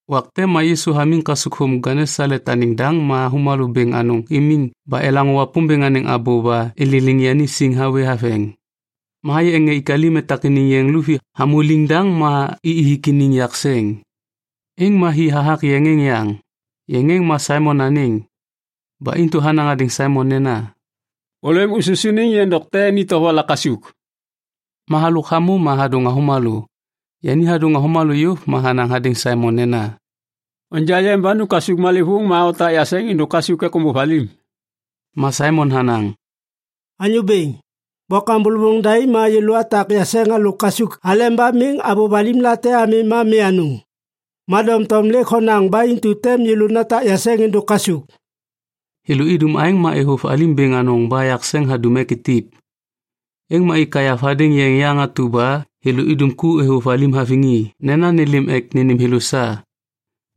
Wak te ma Yisu hamiŋ kasukthôm Genesalet anêŋ daŋ ma avômalô bêŋ anôŋ imiŋ ba elaŋô Wapômbêŋ anêŋ abô ba ililiŋ yani siŋ hawê haveŋ. Ma hayê ŋê ik alim etak iniŋ yeŋ luvi hamô liŋdaŋ ma i ithik iniŋ yakseŋ. Êŋ ma hi hathak yeŋ êŋ yaŋ, yeŋ êŋ ma Saimon anêŋ. Ba intu hanaŋ hadêŋ Saimon nena, “Ôlêm ususuniŋ yeŋ dokte ni tovola kasuk.” Ma halôk hamô ma hadôŋ avômalô. Yani hadôŋ avômalô yôv ma hanaŋ hadêŋ Saimon nena, “Onja yeŋ ba nu kasuk malêvôŋ ma otak yakseŋ êndôk kasuk ek ômbôv alim.” Ma Saimon hanaŋ, “Anyô bêŋ, bôkam bôlôvôŋ daim ma yêlô atak yakseŋ halôk kasuk aleba miŋ avôv alim te ami ma mi anôŋ. Ma doŋtom lêk honaŋ ba intu tem yêlô natak yakseŋ êndôk kasuk.” Thêlô idum aêŋ ma êvôv alim bêŋ anôŋ ba yakseŋ hadum ek itip. Êŋ ma ik kaiyav hadêŋ yeŋ yaŋ atu ba thêlô idum ku êvôv alim haviŋ i nena nêlêm ek nênêm thêlô sa.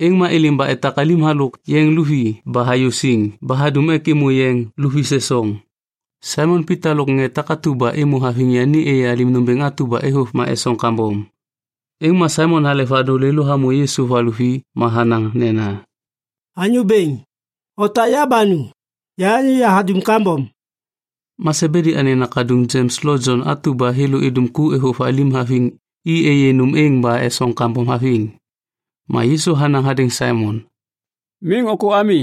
Êŋ ma êlêm ba etak alim halôk yeŋ luvi ba hayô siŋ ba hadum ek êmô yeŋ luvi sesoŋ. Saimon Pita lôk ŋê takatu ba êmô haviŋ yani êyê alim nômbêŋ atu ba êvôv ma esoŋ kambom. Êŋ ma Saimon halek vadôŋ lêlô hamô Yisu va luvi ma hanaŋ nena, “Anyô Bêŋ, otak ya ba nu. Ya anyô yahadum kambom.” Ma Sebedi anêŋ nakaduŋ Jems lo Jon atu ba thêlô idum ku êvôv alim haviŋ i êyê nôm êŋ ba esoŋ kambom haviŋ. Ma Yisu hanaŋ hadêŋ Saimon, “Miŋ ôkô ami.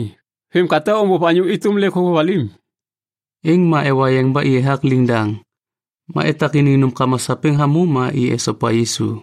Vêm ka tem ômbôv anyô êtôm lêk hôvôv alim.” Êŋ ma ewa yeŋ ba i ethak liŋdaŋ. Ma etak iniŋ nômkama sapêŋ hamô ma i esopa Yisu.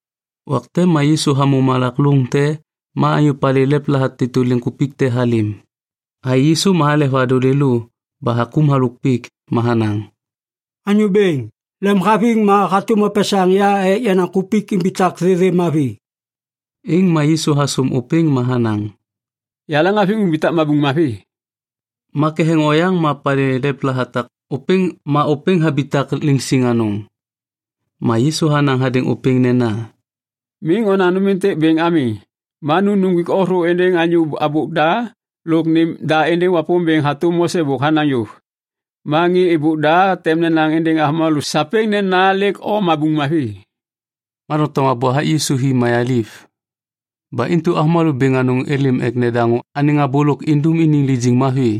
Wak te ma Yisu hamô malak lôŋ te ma anyô palê lepla hatêtô liŋkupik te halêm. Hayê Yisu ma halek vadôŋ lêlô ba hakôm halôk pik. Ma hanaŋ, “Anyô Bêŋ, lemhaviŋ ma hatôm opesaŋ ya ek yenaŋ kupik imbitak thêthê mavi.” Êŋ ma Yisu hasôm ôpêŋ ma hanaŋ, “Yaleŋhaviŋ. Umbitak mabuŋ mavi.” Ma ketheŋ oyaŋ ma palê lepla hatak ôpêŋ ma ôpêŋ habitak liŋsiŋ anôŋ. Ma Yisu hanaŋ hadêŋ ôpêŋ nena, “Miŋ onaŋ nôm êntêk bêŋ ami. Ma nu nuŋgwik o thô êndêŋ anyô habôk da lôk nêm da êndêŋ Wapômbêŋ hatôm Mose bôk hanaŋ yôv. Ma ŋê êbôk da tem nenaŋ êndêŋ avômalô sapêŋ nena lêk o mabuŋ mavi.” Ma doŋtom abô hathak Yisu hi mayaliv. Ba intu avômalô bêŋ anôŋ êlêm ek nedaŋô anêŋ abô lôk indum iniŋ lijiŋ mavi.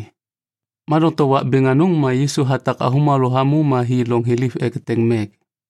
Ma doŋtom wak bêŋ anôŋ ma Yisu hatak avômalô hamô ma hi loŋ thiliv ek eteŋ mek.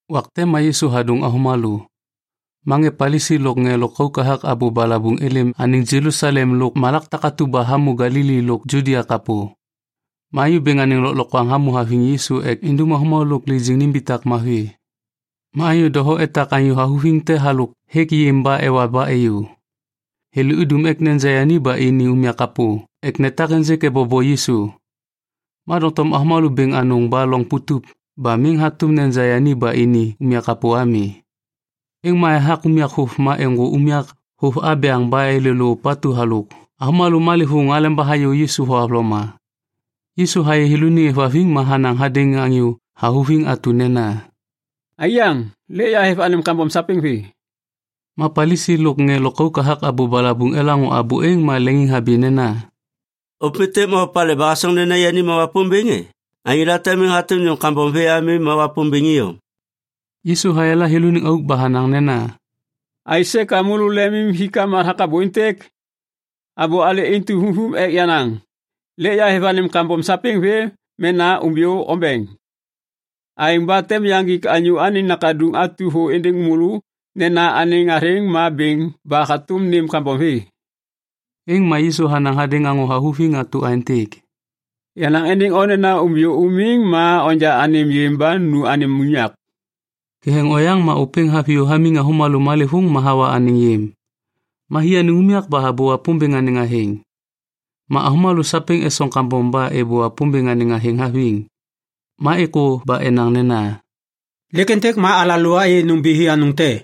Wak te ma Yisu hadôŋ avômalô. Ma ŋê Palisi lôk ŋê lôkauk hathak abô balabuŋ êlêm anêŋ Jelusalem lôk malak takatu ba hamô Galili lôk Judia kapô. Ma Anyô Bêŋ anêŋ lôklokwaŋ hamô haviŋ Yisu ek indum avômalô lôk lijiŋ nimbitak mavi. Ma anyô doho etak anyô havuviŋ te halôk hêk yêm ba ewa ba êyô. Thêlô idum ek neja yani ba ini unyak kapô ek netak ênjêk ebobo Yisu. Ma doŋtom avômalô bêŋ anôŋ ba loŋ putup ba miŋ hatôm neja yani ba ini unyak kapô ami. Êŋ ma ethak unyak vôv ma êŋgô unyak vôv abyaŋ ba êlêlô ôpatu halôk avômalô malêvôŋ aleba hayô Yisu thohavloma. Yisu hayê thêlôniŋ êvhaviŋ ma hanaŋ hadêŋ anyô havuviŋ atu nena, “Aiyaŋ, lêk yahêv anêm kambom sapêŋ vê.” Ma Palisi lôk ŋê lôkauk hathak abô balabuŋ elaŋô abô êŋ ma leŋiŋhabi nena, “Ôpêntêk ma opalê ba hasoŋ nena yani ma Wapômbêŋ e? Anyô late miŋ hatôm nêm kambom vê ami ma Wapômbêŋ iyom.” Yisu hayala thêlôniŋ auk ba hanaŋ nena, “Aisê ka môlô lemimhikam hathak abô êntêk? Abô alê intu vumvum ek yanaŋ: ‘Lêk yahêv anêm kambom sapêŋ vê’ mena ‘Umbiyô ombeŋ.’ Aêŋ ba tem yaŋgik Anyô Anêŋ Nakaduŋ atu thô êndêŋ môlô nena anêŋ athêŋ ma bêŋ ba hatôm nêm kambom vê.” Êŋ ma Yisu hanaŋ hadêŋ anyô havuviŋ atu aêntêk, “Yanaŋ êndêŋ o nena umbiyô umiŋ ma onja anêm yêm ba nu anêm unyak.” Ketheŋ oyaŋ ma ôpêŋ haviyô hamiŋ avômalô malêvôŋ ma hawa anêŋ yêm. Ma hi anêŋ unyak ba habô Wapômbêŋ anêŋ athêŋ. Ma avômalô sapêŋ esoŋ kambom ba êbô Wapômbêŋ anêŋ athêŋ haviŋ. Ma êkô ba enaŋ nena, “Lêk êntêk ma alalô ayê nômbithi anôŋ te.”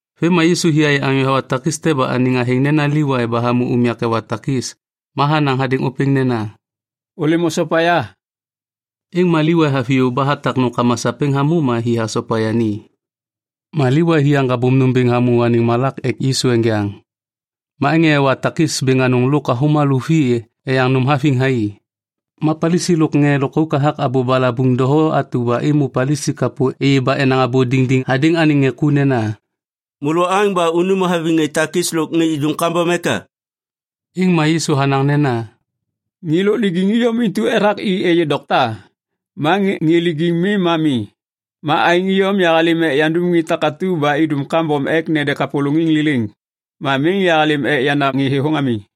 Vêm ma Yisu hi hayê anyô hawa takis te ba anêŋ athêŋ nena Livai ba hamô unyak ewa takis. Ma hanaŋ hadêŋ ôpêŋ nena, “Ôlêm osopa ya.” Êŋ ma Livai haviyô ba hatak nômkama sapêŋ hamô ma hi hasopa yani. Ma Livai hi haŋgabôm nôm bêŋ hamô anêŋ malak ek Yisu enjaŋ. Ma ŋê ewa takis bêŋ anôŋ lôk avômalô vi eyaŋ nôm haviŋ thai. Ma Palisi lôk ŋê lôkauk hathak abô balabuŋ doho atu ba êmô Palisi kapô êyê ba enaŋ abô diŋdiŋ hadêŋ anêŋ ŋê ku nena, “Môlô oaŋ ba unum haviŋ ŋê takis lôk ŋê idum kambom eka?” Êŋ ma Yisu hanaŋ nena, “Ŋê lôk lijiŋ iyom intu ethak i êyê dokta. Ma ŋê lijiŋ mi ma mi. Ma aêŋ iyom yahalêm ek yandam ŋê takatu ba idum kambom ek nede kapôlôŋiŋ liliŋ. Ma miŋ yahalêm ek yandam ŋê thêthôŋ ami.”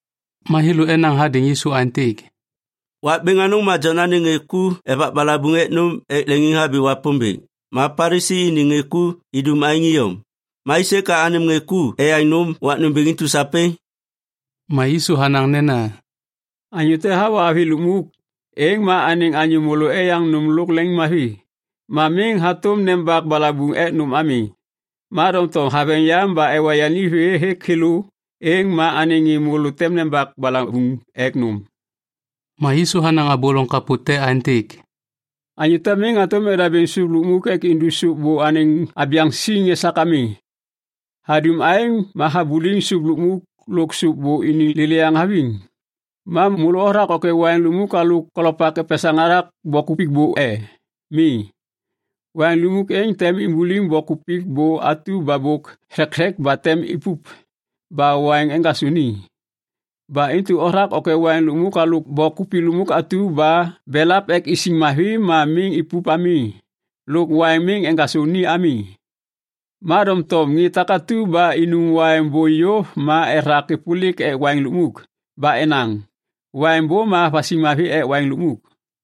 Ma thêlô enaŋ hadêŋ Yisu aêntêk, “Wak bêŋ anôŋ ma Jon anêŋ ŋê ku evak balabuŋ ek nôm ek leŋiŋhabi Wapômbêŋ, ma Palisi iniŋ ŋê ku idum aêŋ iyom. Ma aisê ka anêm ŋê ku eyaŋ nôm wak nômbêŋ intu sapêŋ?” Ma Yisu hanaŋ nena, “Anyô te hawa avi lukmuk, êŋ ma anêŋ anyô môlô eyaŋ nôm lôk leŋiŋmavi. Ma miŋ hatôm nembak balabuŋ ek nôm ami. Ma doŋtom haveŋ yam ba ewa yani vê hêk thêlô, êŋ ma anêŋ ŋê môlô tem nembak balabuŋ ek nôm.” Ma Yisu hanaŋ abô loŋ kapô te aêntêk, “Anyô te miŋ hatôm edabêŋ sôp lukmuk ek indu sôp bô anêŋ abyaŋ siŋ esak ami. Hadum aêŋ ma habuliŋ sôp lukmuk lôk sôp bô iniŋ lêlêyaŋ haviŋ. “Ma môlô othak ôkê waiŋ lukmuk halôk kolopak epesaŋ hathak bok kupik bô e? Mi! Waiŋ lukmuk êŋ tem imbuliŋ bok kupik bô atu ba bôk thekthek ba tem ipup ba waiŋ eŋgasô ni. Ba intu othak ôkê waiŋ lukmuk halôk bok kupik lukmuk atu ba belap ek isiŋ mavi ma miŋ ipup ami lôk waiŋ miŋ eŋgasô ni ami. “Ma doŋtom ŋê takatu ba inum waiŋ bô yôv ma ethak êpôlik ek waiŋ lukmuk. Ba enaŋ, ‘Waiŋ bô ma vasiŋ mavi ek waiŋ lukmuk.’”